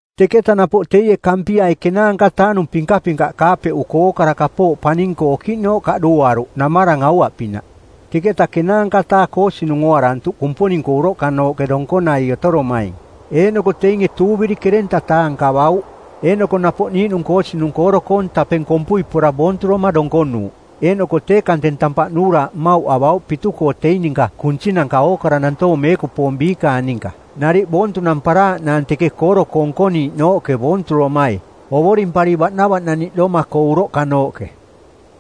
Teketa napoꞌ teie Kampiai ˜kenaanka-taa-nung pinkapinkaꞌ kaapeꞌuko ookara kapooꞌ paning-koo okiꞌnooꞌ kaꞌduuariruꞌ namarang aua-pinaꞌ. Teketa ˜kenaanka-taa koosinung ooarantuꞌ Kumponing-koo uroꞌkanooꞌke donkonai otoromaing, eeꞌnoko teinge tuuviri ˜kerenta-taa nkavauꞌ. Eeꞌnoko napoꞌ niiꞌnung koosinung kooro-koong tapeng kompui pora boonturoma donkonuuꞌ. Eeꞌnoko tee kanteng tampaꞌ nuuraaꞌ mmauꞌ avauꞌ pitu-koo teing ninka kunsinanka ookara nantoong meekupoong biikaang ninka nariꞌ boontunamparaaꞌnaang teke kooro-koo nkoniiꞌnooꞌke boonturomai, ovorimpari baꞌnavaꞌnaniꞌdoma-koo uroꞌkanooꞌke.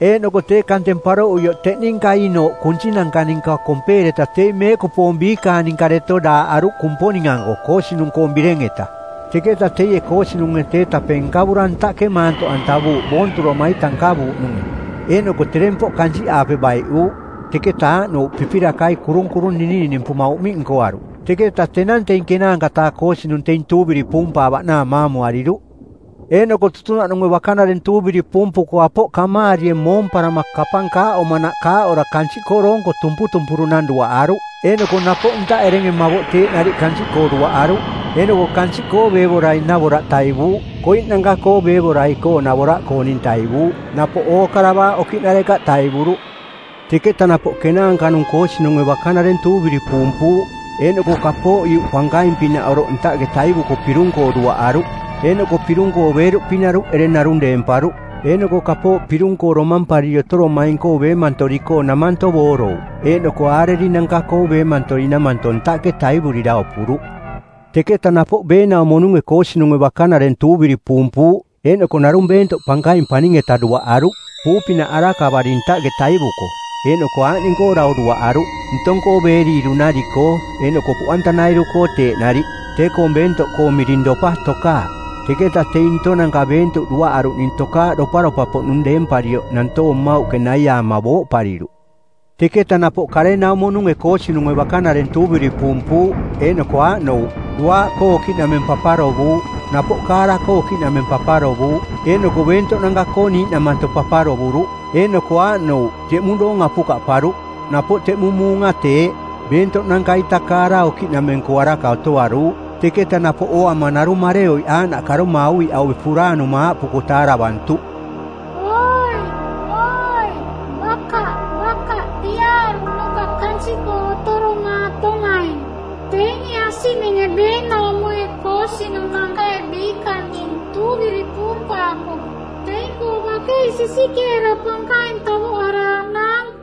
Eeꞌnoko tee kanteng paroꞌuioꞌ teꞌ ninka ii-nooꞌ kunsinanka ninka kompeereta teing meekupoong biikaang ninka deto daaꞌaruꞌ Kumponing-anko koosinung-koong bireng-eta. Teketa teie koosinunge tee tapeng nkavura ntaꞌke maantoꞌantavuuꞌ boonturoma-ita nkavuuꞌnunge, eeꞌnoko terempoꞌ kansiꞌaape baiꞌuuꞌ, teketa aaꞌnouꞌ pipirakai kurung-kurung ninininimpuma uꞌmiꞌ nkoaruꞌ. Teketa tenang teing ˜kenaanka-taa koosinung teing tuuviri puumpaavaꞌnaang maamuariruꞌ. Eeꞌnoko tutunaꞌnunge bakanareng tuuviri puumpuko apoꞌ kamaarie moomparama kapang kaaꞌomanaꞌ kaaꞌora kansiꞌkoo doonko tumputumpurunang duaꞌaruꞌ eeꞌnoko napoꞌ ntaꞌ erenge mavoꞌ teeꞌ nariꞌ kansiꞌkoo duaꞌaruꞌ. Eeꞌnoko kansiꞌkoo beevorai navoraꞌ taivuuꞌ, koiꞌnanka-koo beevorai-koo navoraꞌkooning taivuuꞌ, napoꞌ ookara baaꞌ okiꞌnarekaꞌ taivuruꞌ. Teketa napoꞌ kenaanka-nung koosinunge bakanareng tuuviri puumpuuꞌ, eeꞌnoko kapooꞌ iuꞌ pankaing-pinaꞌ oroꞌ ntaꞌke taivuko pirung-koo duaꞌaruꞌ. Eeꞌnoko pirung-koo beeruꞌpi naruꞌ ereng narung deemparuꞌ. Eeꞌnoko kapooꞌ pirung-koo domampariri otoromaing-koo beemantori-koo namanto boorouꞌ, eeꞌnoko aarerinanka-koo beemantori namanto ntaꞌke taivurira opuruꞌ. Teketa napoꞌ beenaumo-nunge koosinunge bakanareng tuuviri puumpuuꞌ, eeꞌnoko narung beentoꞌ pankaing paning-eta duaꞌaruꞌ, puu-pinaꞌ arakavari ntaꞌke taivuko, eeꞌnoko aaꞌning-koo dau duaꞌaruꞌ: ntong-koo beeriiru-nari-koo eeꞌnoko puꞌantanairu-koo teeꞌ nariꞌ. Tee-koong beentoꞌkoong miring Dopa Tokaaꞌ. Teketa teing ntonanka beentoꞌ duaꞌaruꞌning tokaaꞌ doparopa-poꞌnung deemparioꞌ nantoong mmauꞌke naiaama booꞌpariruꞌ. Teketa napoꞌ karenaumo-nunge koosinunge bakanareng tuuviri puumpuuꞌ eeꞌnoko aaꞌnouꞌ: duaaꞌkoo okiꞌnameng paparovuuꞌ, napoꞌ kaara-koo okiꞌnameng paparovuuꞌ, eeꞌnoko beentoꞌnanka-koo niiꞌnamanto paparovuruꞌ. Eeꞌnoko aaꞌnouꞌ: teꞌmung doong apukaꞌparuꞌ. Napoꞌ teꞌmung muunga teeꞌ, beentoꞌnanka-ita kaara okiꞌnameng-koo araka otoaruuꞌ. Teketa napoꞌ ooama narung mareoiꞌ aaꞌnaꞌ karoma auviꞌaue puraanuma aaꞌpuko taaravantuꞌ, “Oi, oi, bakaꞌ, bakaꞌ piaaruꞌnuka kansiꞌkoo otoromaatomaing. Teinge asiꞌninge beenaumoi koosinunankai biikaning tuuviri puumpaako teing-koo bakei sisikeera pankaing tavoꞌaraaꞌnaang.”